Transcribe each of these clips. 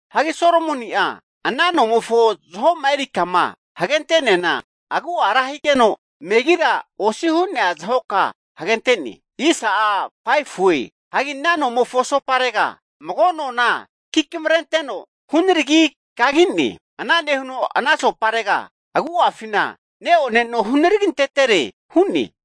Hagi Solomoni'a ana nomofo zaho'ma eri kama hagente'neana agu'a ra higeno, megira osi hu'nea zahoka hagente'ne. Hanki ana nomofo asoparega mago nona kikamrenteno hunaragino kagine. Ana nehuno ana asoparega agu'afina neone no hunaragintetere hu'ne.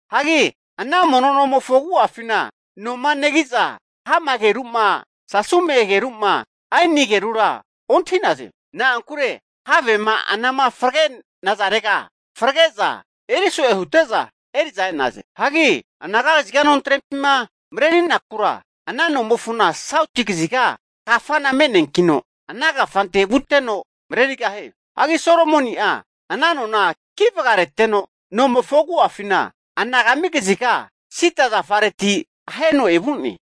Hagi ana mono nomofo agu'afina noma negi'za hama ageru'ma, sasume ageru'ma, aini agerura ontahi'naze. Na'ankure havema anama fragenazarega frage'za eriso'e hute'za eri'za e'naze. Hagi anaga kaziga nontrempima marerinakura, ana nomofona sauti kaziga kafana me'neankino, ana kafante vuteno marerigahie. Hagi Solomoni'a ana nona kivagareteno, nomofo agu'afina anagami kaziga (silinia) sida zafareti aheno evu'ne.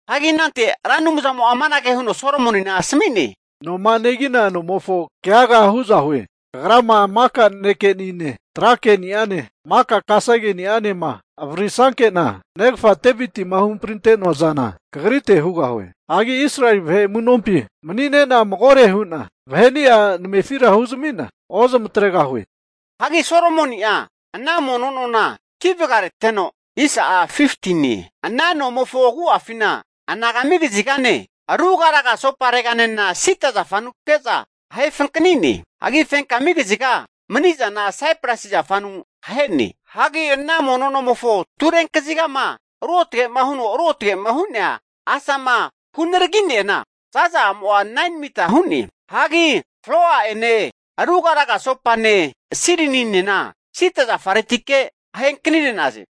Hagi anante Ra Anumzamo'a amanage huno Solomonina asami'ne, noma negina nomofo keaga hu'za hue, Kagrama maka nanekenine, tra ke'ni'ane, maka kasegeni'anema avaririsanke'na, negafa Devitima huhamprinte'noa zana kagrite hugahue. Hagi Israeli vahe amu'nompi mani'nena magore hu'na vaheni'a namefira huzami'na ozamatregahue. Hagi Solomoni'a ana mono nona kivagareteno, ana nomofo agu'afina anagami kazigane, rugaraga asopareganena sida zafanuke'za ahe fankanine. Hagi fenkami kaziga manizana saipresi zafanu ahe'ne. Hagi ana mono nomofo turenkazigama ruotge'ma huno ruotgema hu'nea asama hunaragi'neana, zaza'amo'a 9mita hu'ne. Hagi floa'ene, rugaraga asopane, silininena sida zafaretike ahe anknire'naze.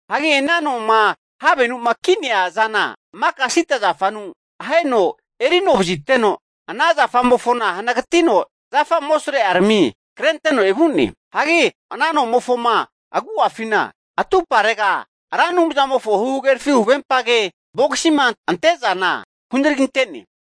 Hagi ana noma havenu'ma ki'nea zana maka sida zafanu aheno erinovaziteno, ana zafamofona hanagatino, zafa amosrerami krenteno evu'ne. Hagi ana nomofoma agu'afina atumparega Ra Anumzamofo huhagerafi huvempage vogisima ante'zana hunaraginte'ne.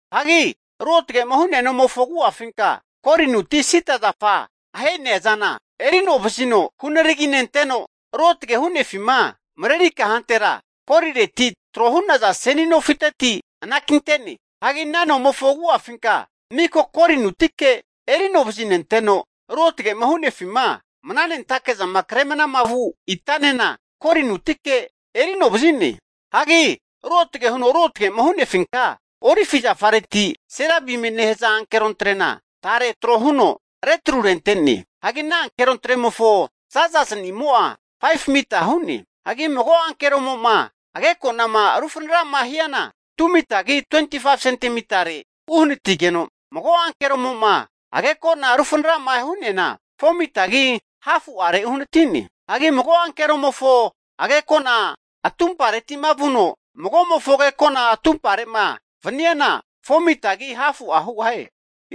Hagi ruotge'ma hu'nea nomofo agu'afinka golinuti sida zafa aheneazana erinonevazino hunaraginenteno, ruotge hunefima mareri kahantera golireti tro hu'naza seni nofiteti anakinte'ne. Hagi ana nomofo agu'afinka miko golinutike eri anovazinenteno ruotge'ma hu'nefima mnanentakezama kre mnama vu itanena golinutike eri anovazi'ne. Hagi ruotage huno ruotge'ma hu'nefinka olive zafareti serabimie nehaza ankerontre'na tare trohuno, retrurente'ne. Hagi ana ankerontremofo zazaznimo'a 5mita hu'ne. Hagi mago ankeromo'ma ageko'nama rufana'rama hiana, 2mitagi 25sentimitare uhanatigeno, mago ankeromo'ma ageko'na rufanara'ma hu'neana 4mitagi hafu'are uhanatine. Hagi mago ankeromofo agekona atumpareti'ma vuno mago'mofo agekona atumpare'ma vaniana, 4mitagi hafu hugahie.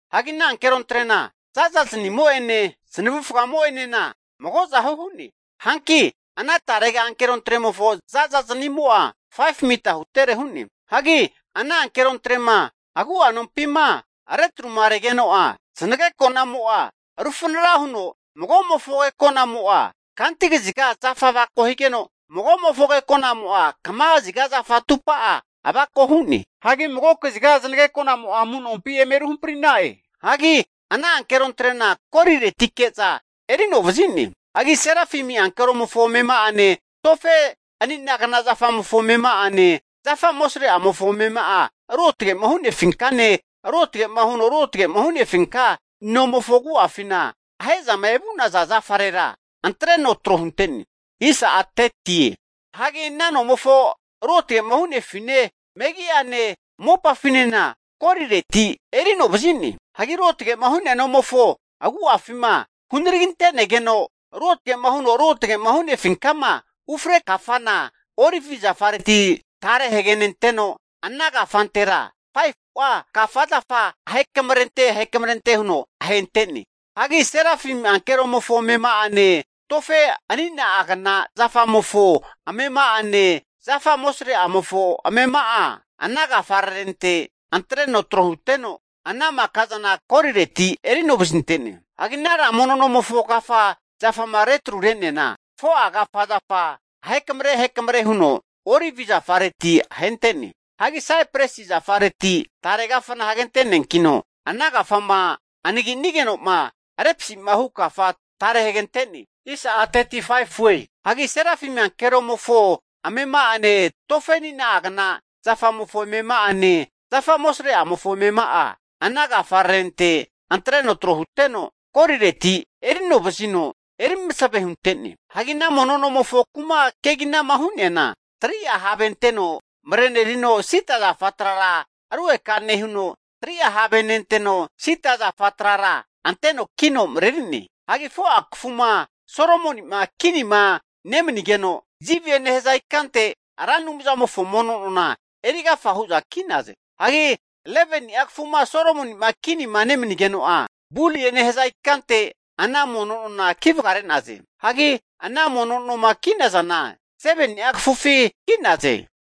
Hagi ana ankerontrena za'zaznimo'ene zanavufagamo'enena magozahu hu'ne. Hanki ana tarega ankerontremofo za'za zanimo'a 5mita hutere hu'ne. Hagi ana ankerontrema agu'a nompima retruma regeno'a, zanageko'namo'a rufanara huno magomofo ageko'namo'a kanti kaziga zafa avako higeno, magomofo agekonamo'a kama kaziga zafa atupa'a avako hu'ne. Hagi mago kaziga zanageko'namo'a amu'nompi eme ruhampri'na'e. Hagi ana ankerontrena goliretike'za eri anovazi'ne. Hagi serafimi ankeromofo amema'ane, tofe anina'agna zafamofo amema'ane zafa amosre'amofo amema'a ruotge'ma hunefinkane ruotge'ma huno ruotgetfama hunefinka nomofo agu'afina ahe'zama evu'naza zafarera antreno tro hunte'ne. Hagi ana nomofo ruotge'ma hu'nefine, megi'ane mopafinena golireti eri'novazi'ne. Hagi ruotge'ma hu'nea nomofo agu'afima, hunaraginte'negeno ruotgema huno ruotge'ma hu'nefinkama ufre kafana olivi zafareti tare hagenenteno, ana kafantera 5fu'a kafa zafa ahekamre ahekamre huno ahente'ne. Hagi serafimi ankeromofo amema'ane tofe anina'agna zafamofo amema'ane zafa amosreamofo amema'a ana kafararente antreno tro huteno, ana makazana golireti eri anovazinte'ne. Hagi ana ra mono nomfo kafa zafama retrure'neana, 4'a kafa zafa ahekamre ahekamre huno olivi zafareti ahente'ne. Hagi saipresi zafareti tare kafana hagente'neakino, ana kafama anagi'nigeno'ma repsi'ma hu kafa tare hagente'ne. Hagi serafimi ankeromofo amema'ane tofe anina'agna zafamofo amema'ane zafa amosreamofo amema'a ana kafararente antreno tro huteno, golireti eri anovazino erimasave hunte'ne. Hagi ana mono nomofo kuma keginama hu'neana, 3'a have anteno marenerino sida zafa trara rugeka nehuno, 3'a have nenteno, sida zafa trara nenteno kino mareri'ne. Hagi 4'a kafuma Solomoni'ma kinima nemanigeno, Zivie nehaza ikante Ra Anumzamofo mono nona eri agafa hu'za ki'naze. Hagi 11ni'a kafuma Solomoni'ma kinima nemanigeno'a, Bulie nehaza ikante ana mono nona ki vagare'naze. Hagi ana mono noma ki'nazana, 7ni'a kafufi ki'naze.